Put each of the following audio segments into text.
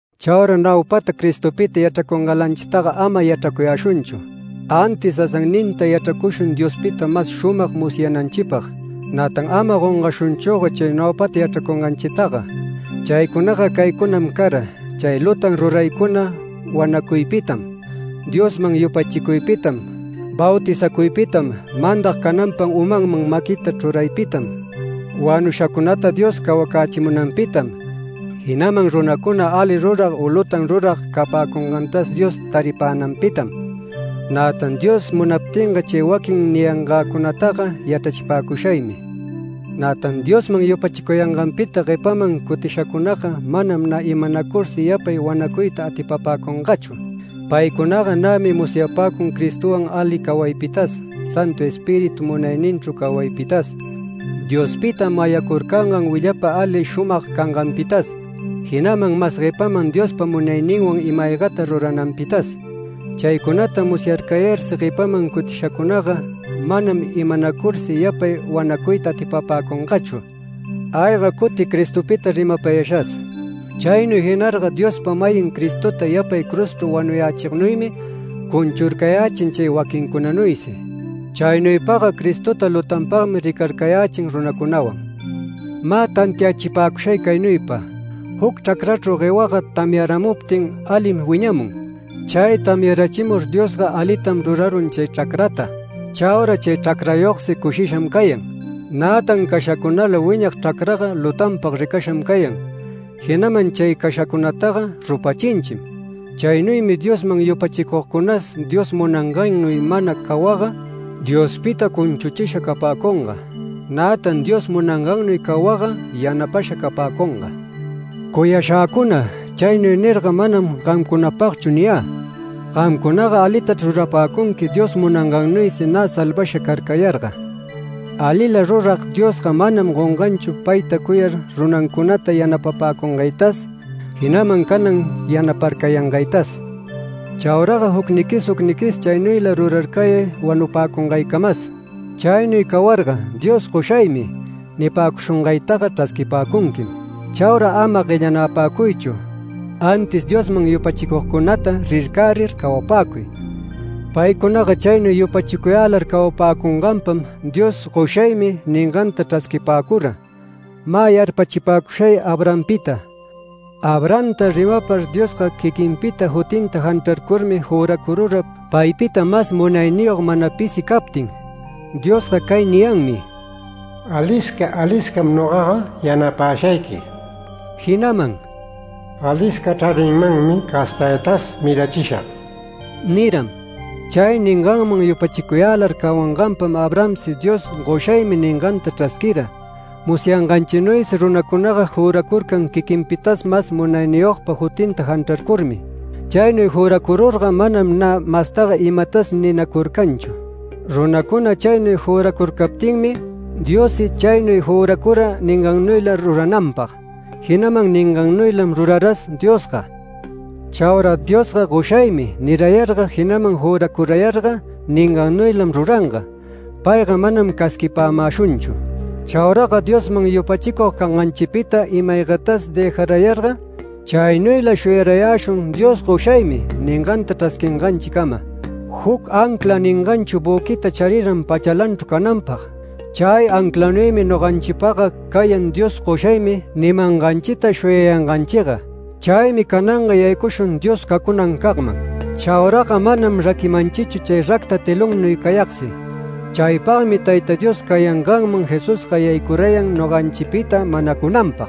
Chaura naupata Cristopita yachracungalanchitaga ama yachracuyäshunchu, antis sasanninta yachracushun Diospita mas shumag musyananchipag. Nätan ama gongashunchüga chay naupata yachracunganchitaga. Chaycunaga caycunam cara: chay lutan ruraycuna wanacuypitam, Diosman yupachicuypitam, bautizacuypitam, mandag cananpag umanman maquita chruraypitam, wanushacunata Dios cawacächimunanpitam, jinaman runacuna ali rurag u lutan rurag capäcungantas Dios taripänanpitam. Nätan Dios munaptinga chay waquin niyangäcunataga yachrachipäcushaymi. Nätan Diosman yupachicuyanganpita guepaman cutishacunaga manam nä imanacursi yapay wanacuyta atipapäcungachu. Paycunaga nämi musyapäcun Cristowan ali cawaypitas, Santu Espíritu munayninchru cawaypitas, Diospita mayacurcangan willapa ali shumag canganpitas, jinaman mas guepaman Diospa munayninwan ima-aygata rurananpitas. Chaycunata musyarcayarsi guepaman cutishacunaga manam imanacursi yapay wanacuyta atipapäcungachu, ayga cuti Cristopita rimapayashas. Chaynuy jinarga Diospa-mayin Cristota yapay cruzchru wanuyächignuymi cunchurcayächin chay waquincunanuysi. Chaynuypaga Cristota lutanpagmi ricarcayächin runacunawan. Mä tantiachipäcushay caynuypa: Juc chracrachru guewaga tamyaramuptin alim wiñamun. Chay tamyarachimur Diosga alitam rurarun chay chracrata. Chaura chay chracrayogsi cushisham cayan. Nätan cashacunala wiñag chracraga lutanpag ricasham cayan, jinaman chay cashacunataga rupachinchim. Chaynuymi Diosman yupachicugcunas Dios munangannuy mana cawagga Diospita cunchuchisha capäcunga, nätan Dios munangannuy cawagga yanapasha capäcunga. Cuyashäcuna, chaynuy nirga, manam gamcunapagchu niyä. Gamcunaga alitachr rurapäcunqui Dios munangannuysi nä salvasha carcayarga. Alila rurag Diosga manam gonganchu payta cuyar, runancunata yanapapäcungaytas, jinaman canan yanaparcayangaytas. Chauraga jucniquis jucniquis, chaynuyla rurarcayay wanupäcungaycamas. Chaynuy cawarga Dios “Goshaymi” nipäcushungaytaga chrasquipäcunquim. Chaura ama guellanapäcuychu, antis Diosman yupachicugcunata rircärir cawapäcuy. Paycunaga chaynuy yupachicuyälar cawapäcunganpam Dios “Goshaymi” ninganta chrasquipäcura. Mä yarpachipäcushay Abrahampita. Abrahamta rimapar Diosga quiquinpa jutinta janchrarcurmi juracurura paypita mas munayniyog mana pisi captin. Diosga cay niyanmi: “Alisca aliscam nogaga yanapäshayqui”, jinaman “Alisca chraninmanmi castaytas mirachishag” niram. Chay ninganman yupachicuyälar cawanganpam Abrahamsi Dios “Goshaymi” ninganta chrasquira. Musyanganchinuysi runacunaga juracurcan quiquinpitas mas munayniyogpa jutinta janchracurmi. Chaynuy juracururga manam nä mastaga imatas ninacurcanchu. Runacuna chaynuy juracurcaptinmi Diossi chaynuy juracura ningannuyla rurananpag, jinaman ningannuylam ruraras Diosga. Chaura Diosga “Goshaymi” nirayarga, jinaman juracurayarga ningannuylam ruranga, payga manam casquipämäshunchu. Chauraga Diosman yupachicug canganchipita ima-aygatas dëjarayarga, chaynuyla shuyarayäshun Dios “Goshaymi” ninganta chrasquinganchicama. Juc ancla ninganchu büquita chariran pachalanchru cananpag. Chay anclanuymi noganchipagga cayan Dios “Goshaymi” nimanganchita shuyayanganchiga. Chaymi cananga yaycushun Dios cacunancagman. Chauraga manam raquimanchichu chay racta telonnuy cayagsi. Chaypagmi Tayta Dios cayanganman Jesusga yaycurayan noganchipita manacunanpag.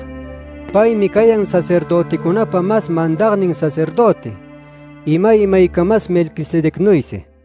Paymi cayan sacerdöticunapa mas mandagnin sacerdöti, imay imaycamas Melquisedecnuysi.